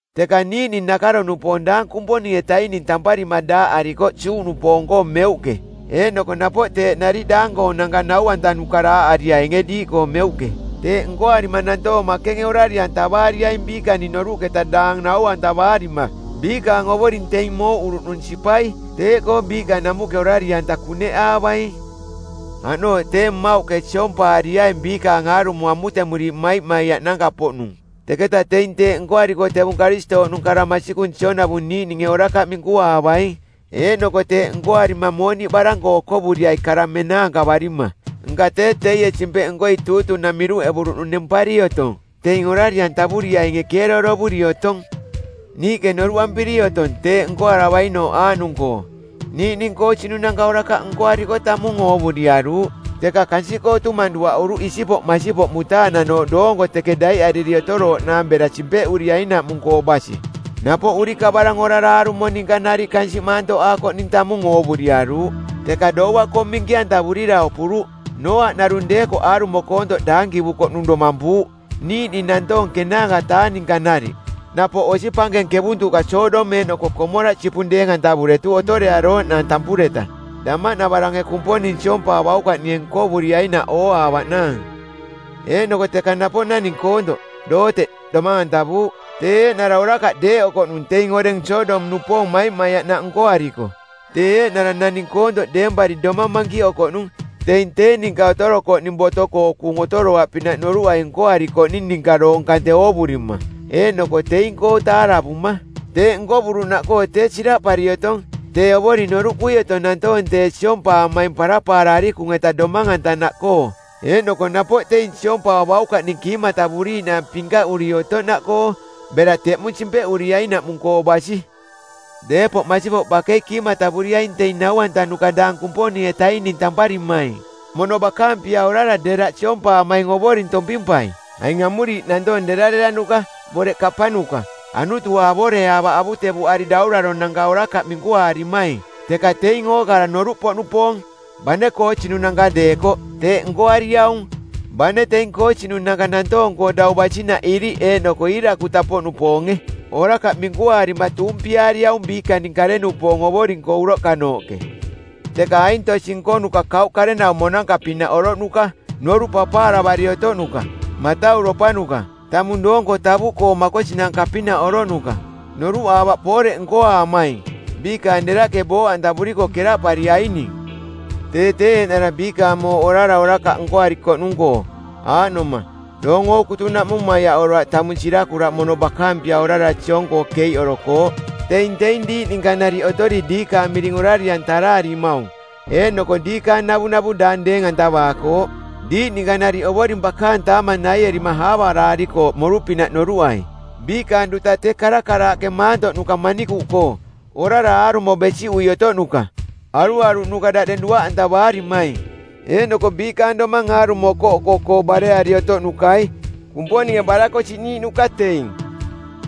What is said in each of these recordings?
Teka niiꞌning nakaro-nupoong daang Kumponing-etaining tamparima daaꞌarikoꞌ Juꞌnupoong-koo meuꞌke, eeꞌnoko napoꞌ teeꞌ nariꞌ daang-koonanka nau-antanuka daaꞌariainge diiꞌkoo meuꞌke. Teeꞌ nkoarima nantoong makenge orari-antavaariaing biikaning noruꞌketa daang nau-antavaarima, biikaang Ovoring teing mooꞌuruꞌnung sipai. Teeꞌkoo biiꞌka namuꞌke orari-anta kuneꞌaavaing. Aꞌnooꞌ tee mmauꞌke siompaariaing biikaang aarumo amutemuriiꞌ maimaiaꞌnanka-poꞌnung. Teketaꞌ teing teeꞌ nkoariko tevung Karistooꞌnung kara masikung sionavung niiꞌninge orakaꞌ minkuaavaing. Eeꞌnoko teeꞌ nkoarima mooniꞌ barang-koo okovuriai kara menaankavarima. Nka tee teie Simpeꞌnkoi˜ tuutunang˜ miruꞌevuruꞌnung nempari otong. Teing orari-antavuriainge keeroorovuri otong. Niiꞌke noruꞌampiri otong teeꞌ nkoaravainooꞌ aaꞌnung-koo: Niiꞌning koosinunanka orakaꞌ nkoariko tamung oovuriaruuꞌ, teka kansiꞌkoo tumang duaꞌuruꞌ isipoꞌ masipoꞌ mutaananooꞌ doonko teke daiꞌariri otorooꞌnaang bera simpeꞌuriainaꞌmung-koo basi. Napoꞌ urikavarang orara aarumo ninka nariꞌ kansiꞌ maantoꞌaakoꞌning tamung oovuriaruuꞌ, teka doua-koo minki-antavurira opuruꞌ, Nooaꞌ narung deekoꞌ aarumo koontoꞌ daankivukoꞌnung domampuuꞌ, niiꞌning nantoong ˜kenaanka-taa ninka nariꞌ. Napoꞌ osi pankeng kevuntuꞌka Sodom eeꞌnoko Komoraꞌ sipung deeng-antavuretuꞌ otorearooꞌnaang tampureta damaꞌnavarange Kumponing siompaavaukaꞌninge nkovuriainaꞌ ooaavaꞌnaang. Eeꞌnoko teka napoꞌ naning koontoꞌ, Looteꞌ, domang-antavuuꞌ, tee eeꞌnara orakaꞌ deeꞌokoꞌnung teing oreng Sodom-nupoong maimaiaꞌnaꞌ nkoariko. Tee eeꞌnara naning koontoꞌ deempari domang mankiꞌokoꞌnung teing tee ninka otorokoꞌning boto-koo kuung otoroaꞌpinaꞌ noruꞌai nkoarikoꞌning ninka doong kante oovurima eeꞌnoko teing-koo taaravuma. Teeꞌ nkovuruꞌnaꞌkoo tee siraꞌpari otong tee Ovoring noruꞌkui otong nantoong tee siompaamaing parapaara arikung-eta domang-antanaꞌkoo eeꞌnoko napoꞌ teing siompaavaukaꞌning kiimatavuriiꞌnaang pinkaꞌuri otoꞌnaꞌkoo bera teꞌmung simpeꞌuriainaꞌmung-koo basi. Deepoꞌ masipoꞌ bakei kiimatavuriaing teing nau-antanuka daang Kumponing-etaining tamparimaing. Mono bakaang pia orara deraꞌ siompaamaing Ovoring tompimpai. Aing amuriiꞌ nantoong derareranuka, boreꞌ kapanuka, anutua avoreaavaꞌ avutevuꞌari dauraronanka orakaꞌ minkuaarimaing, teka teing ookara noruꞌpoꞌnupoong, bane koosinunanka deekoꞌ, teeꞌ nkoariaung. Bane teing koosinunanka nantoong-koo dau basinaꞌ iriꞌ eeꞌnoko iirakutapoꞌnupoonge orakaꞌ minkuaarima tuumpiaariaung biikaning kare-nupoong Ovoring-koo uroꞌkanooꞌke. Teka aing tosi nkonuka kauꞌ karenaumonanka-pinaꞌ oroꞌnuka, noruꞌ papaaravari otoꞌnuka, matauropanuka, tamung doonko tavuꞌkoo makosinanka-pinaꞌ oroꞌnuka. Noruꞌaavaꞌ pooreꞌ nkoaamaing. Biikaang deraꞌke booꞌantavuriko keraꞌpariaining. Tee tee eeꞌnara biikaang mooꞌ orara orakaꞌ nkoarikoꞌnung-koo, aaꞌnoma: doong ookutunaꞌmung maiaꞌoroaꞌ tamung sirakuraꞌ mono bakaang pia orara siong-koo keiꞌorokooꞌ. Teing teing diiꞌ ninka nariꞌ otori diikaang miring orari-antaraarimaung eeꞌnoko diikaang navunavu daang deeng-antavaakooꞌ. Diiꞌ ninka nariꞌ Ovoring bakaang taamang naierima aavaraarikooꞌ moru-pinaꞌ noruꞌai. Biikaang duta tee karakaraaꞌke maantoꞌnuka manikuꞌkoo, orara aarumo besiꞌui otoꞌnuka, aruaruꞌnuka daꞌdeng duaꞌantavaarimaing, eeꞌnoko biikaang domang aarumo okoꞌoko-koo bareari otoꞌnukai. Kumponinge barakosiꞌniiꞌnuka teing.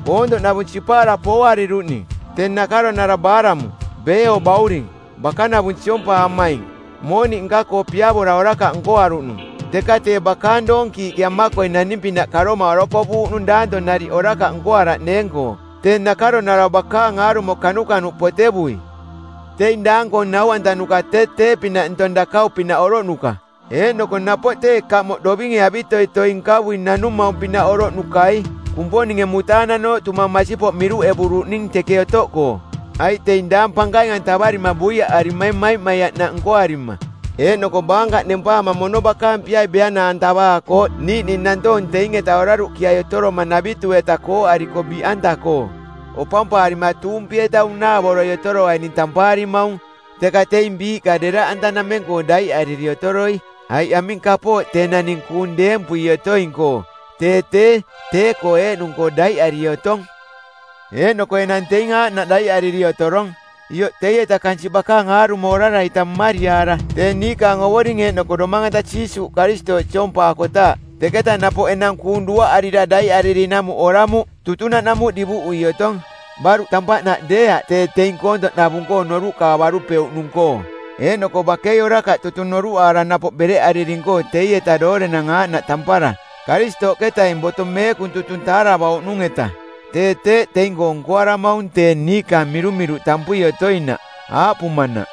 Koontoꞌnavung sipaara pooariruꞌning. Tee nakaronara Baalamu, Beeoo bauring, bakanavung siompaamaing, mooniꞌ nka-koo piavora orakaꞌ nkoaruꞌnung. Teka tee bakaang doonkiiꞌke amakoi naning-pinaꞌ karoma orokovuuꞌnung danto nariꞌ orakaꞌ nkoaraꞌneeng-koo, tee nakaronara bakaang aarumo kanukanuꞌ potevui. Teing daang-koong nau-antanuka tee tee-pinaꞌ ntong dakau-pinaꞌ oroꞌnuka, eeꞌnoko napoꞌ tee kamoꞌ dovinge avitoitoi nkavui nanumaung-pinaꞌ oroꞌnukai, Kumponinge mutaananooꞌ tumang masipoꞌ miruꞌevuruꞌning teke otoꞌkoo. Aiꞌ teing daang pankaing-antavarima buiaꞌarimaing maimaiaꞌnaꞌ nkoarima, eeꞌnoko baankaꞌ nempaama mono bakaang piai beana-antavaakooꞌ niiꞌning nantoong teing-eta oraruꞌkiai otoromanavitu-eta kooꞌariko biꞌanta-koo. Opampaarima tuumpi-eta unaavoroi otoroaining tampaarimaung, teka teing biiꞌka deraꞌantanameng-koo daiꞌariri otoroi, aiꞌ aming kapooꞌ tee naning kuung deempui otoing-koo, tee tee, tee-koo eeꞌnung-koo daiꞌari otong. Eeꞌnoko enang teing aaꞌnaꞌ daiꞌariri otorong, ioꞌ teieta kansiꞌ bakaang aarumo orara-ita mmariaara, tee niikaang Ovoring eeꞌnoko Domang-anta Jiisuuꞌ Karistooꞌ siompaakotaaꞌ, teketa napoꞌ enang kuung duaꞌarira daiꞌaririnamuꞌ oramuꞌ. Tutunaꞌnamuꞌ divuꞌui otong. Baruꞌ tampaꞌnaꞌ deeaꞌ tee teing koontoꞌnavung-koo noruꞌkaavarupeuꞌnung-koo, eeꞌnoko bakei orakaꞌ tutung noruꞌaara napoꞌ bereꞌariring-koo teieta doorenang aaꞌnaꞌ tampara, Karistooꞌketaing boto meekung tutung taaravauꞌnung-eta. Tee teeꞌ teing-koo nkoaramaung tee niikaang mirumiruꞌ tampui otoinaꞌ, aaꞌpumanaꞌ,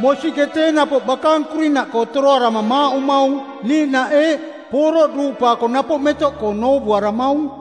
“Mosiꞌke tee napoꞌ bakaang kurinaꞌkoo toroarama maaꞌumaung,” niiꞌnaꞌ eeꞌ, “Pooroꞌ duuꞌpaako napoꞌ metoꞌkoo novuuaramaung.”